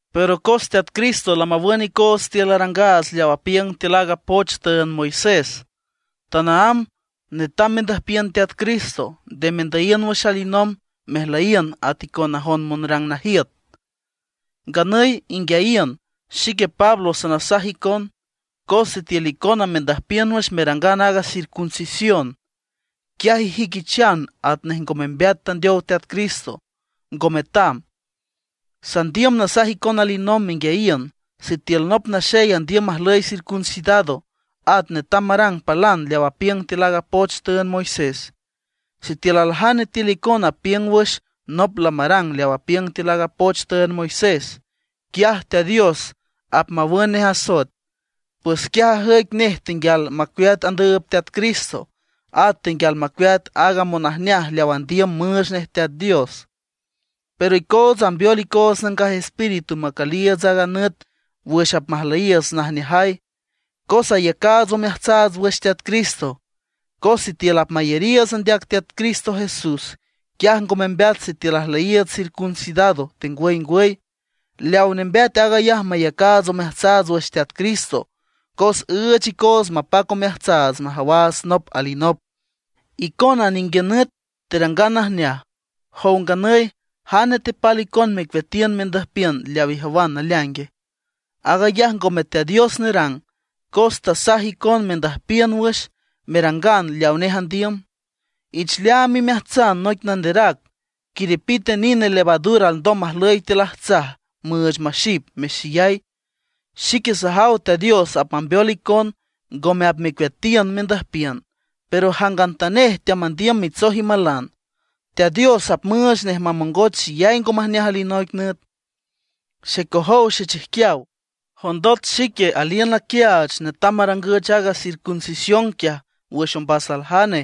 Pero cos Teat Cristo lamawün icoots tiül arangaats leaw apiüng tiül aaga poch tüünd Moisés, tanaámb netam mendüjpiün Teat Cristo; nde mendüyiün wüx alinomb mejlüyiün at icon najon monrang najiüt. Nganüy inguiayiün, xique Pablo sanasaj icon, cos sitiül icona mendüjpiün wüx merangan aaga circuncisión, quiaj ijüiquichan atnej ngo membeat tandeow Teat Cristo, ngo metam. Sandiüm nasaj icon alinomb menguiayiün, sitiül nop naxey andiüm majlüy circuncidado, at netam marang palan leaw apiüng tiül aaga poch tüünd Moisés. Sitiül aljane tiül icona apiüng wüx nop lamarang leaw apiüng tiül aaga poch tüünd Moisés, quiaj Teat Dios apmawün nej asoet, pues quiaj ajüic nej tenguial macueat andüüb Teat Cristo; at tenguial macueat aaga monajneaj leaw andiüm müüch nej Teat Dios. Pero icootsa ambeol icoots Nangaj Espíritu macüliiüts a nüt wüx apmajlüyiiüts najneajay, cos ayacaats omeajtsaats wüx Teat Cristo. Cos sitiül apmayariiüts andeac Teat Cristo Jesús, quiaj ngo membeat sitiül ajlüyiiüts circuncidado, tengwüy ngwüy. Leaw nembeat aag ayaj mayacaats omeajtsaats wüx Teat Cristo, cos üüch icoots mapac omeajtsaats majawaats nop alinop. Icona ninguiün nüt terangan najneaj. Jow nganüy, ¿jane tepal icon mecueatiün mendüjpiün leaw ijawan naleaingue? Aag ayaj ngome Teat Dios nerang, cos tasaj icon mendüjpiün wüx merangan leawa nej andiüm. Ich leaam imeajtsan noic nanderac: quiripite nine levadura alndom majüy tiül ajtsaj, müüch maxip, mexeyay. Xique sajaw Teat Dios apmambeol icon, ngome apmecueatiün mendüjpiün. Pero jangantanej teamandiüm mitsoj imalan, Teat Dios apmüüch nej mamongoch xeyay ngo majneaj alinoic nüt. Xecojow xechijquiaw, jondot xique aliün naquiaach netam marangüch aaga circuncisión quiaj wüx ombas aljane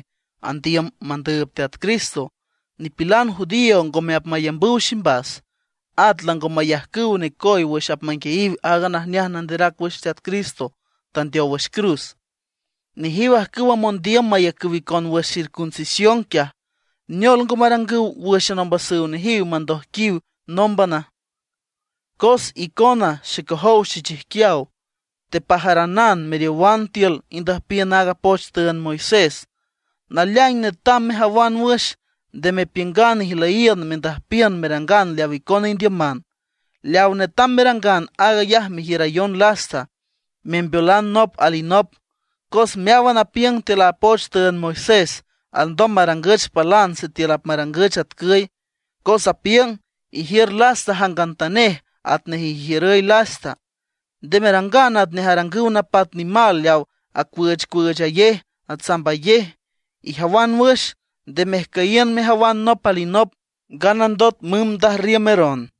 andiüm mandüüb Teat Cristo, nipilan judío ngome apmayambüw ximbas; at lango mayajcüw necoy wüx apmanguiayiw aaga najneaj nanderac wüx Teat Cristo tandeow wüx cruz. Nejiw ajcüwa mondiüm mayacüw icon wüx circuncisión quiaj, ¿neol ngo marangüw wǘxan ombasüw nejiw mandoijquiw nómbana? Cos icona xecojow xechijquiaw, tepajaranan meriowan tiül indüjpiün aaga poch tüünd Moisés. Naleaing netam mejawan wüx, nde mepiüngan ijlüyíünan mendüjpiün merangan leaw icona indiüman. Leaw netam merangan aag ayaj mejiürayon lasta, membeolan nop alinop. Cos meáwan apiüng tiül a poch tüünd Moisés alndom marangüch palan sitiül apmarangüch atcüy, cos apiüng: “Ijiür lasta jangantanej atnej erjiürüy lasta.” Nde merangan atnej arangüw napat nimal leaw acüüchcüüchayej, atsambayej. Ijawan wüx, nde mejcüyiün mejawan nop alinop, nganandot mümb ndajrriümeron.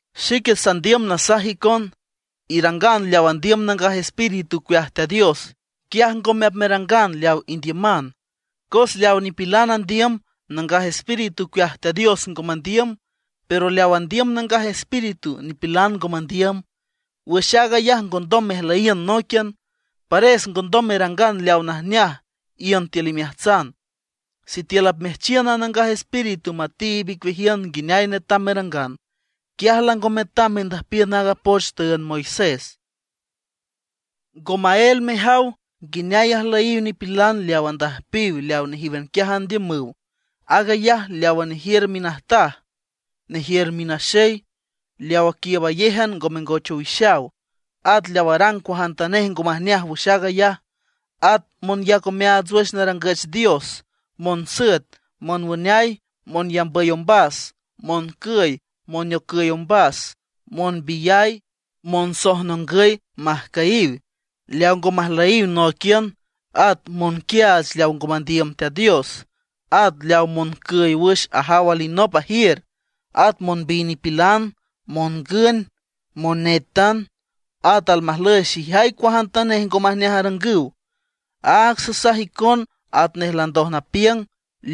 Xique sandiüm nasaj icon: Irangan leaw andiüm Nangaj Espíritu ocueaj Teat Dios, quiaj ngome apmerangan leaw indiüman. Cos leaw nipilan andiüm, Nangaj Espíritu ocueaj Teat Dios ngo mandiüm. Pero leaw andiüm Nangaj Espíritu, nipilan ngo mandiüm. Wüx aag ayaj ngondom mejlüyiün nóiquian; pares ngondom merangan leaw najneaj iün tiül imeajtsan. Sitiül apmeajchiün a Nangaj Espíritu matiib icueajiün nguineay netam merangan, quiaj lango metam mendüjpiün aaga poch tüünd Moisés. Ngo maél mejaw nguineay ajlüyiw nipilan leaw andüjpiw leaw nejíwan quiaj andiümüw: aag ayaj leawa nejiür minajtaj, nejiür minaxey, leaw aquiiübayéjan ngo mengoch owixaw, at leaw arang cuajantanej ngo majneaj wüx aag ayaj. At monyac omeaats wüx narangüch dios, monsüet, monwüneay, monyambüy ombas, moncüy, moneocüy ombas, monbiyay, monsojnongüy majcüyiw, leaw ngo majlüyiw nóiquian, at monquiaach leaw ngo mandiüm Teat Dios. At leaw moncüy wüx ajaw alinop ajiür, at monbiy nipilan, mongün, monétan, at almajlüy xeyay cuajantanej ngo majneaj arangüw. Áag sasaj icon atnej landoj napiüng,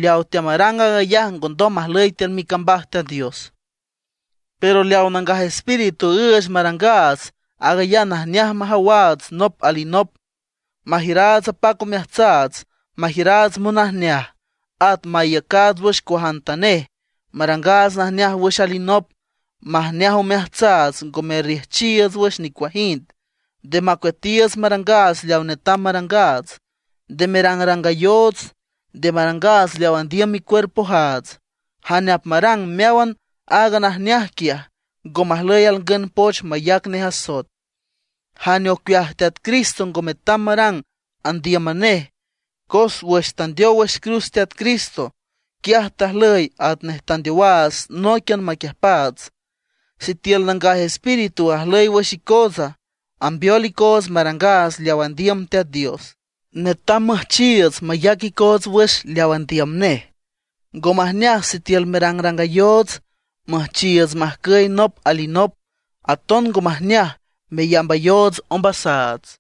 leaw teamarang aag ayaj ngondom majlüy tiül micambaj Teat Dios. Pero leaw Nangaj Espíritu üüch marangaats, aag ayaj majneaj majawaats nop alinop, majiüraats apac omeajtsaats, majiüraats monajneaj, at maiücaats wüx cuajantanej, marangaats najneaj wüx alinop, majneaj omeajtsaats ngo merrejchiiüts wüx nicuajind, nde macueatiiüts marangaats leaw netam marangaats. Nde merangrangayoots, nde marangaats leaw andiüm micuerpojaats. Jane apmarang meáwan aaga najneaj quiaj, ngo majlüy alngün poch mayac nej asoet. Jane ocueaj Teat Cristo ngo metam marang andíüman nej. Cos wüx tandeow wüx cruz Teat Cristo, quiaj tajlüy atnej tandeowaats nóiquian maquiüjpaats. Sitiül Nangaj Espíritu ajlüy wüx icootsa, ambeol icoots marangaats leaw andiüm Teat Dios, netam müjchiiüts mayac icoots wüx leaw andiüm nej. Ngo majneaj sitiül merangrangayoots, müjchiiüts majcüy nop alinop; aton ngo majneaj meyambayoots ombasaats.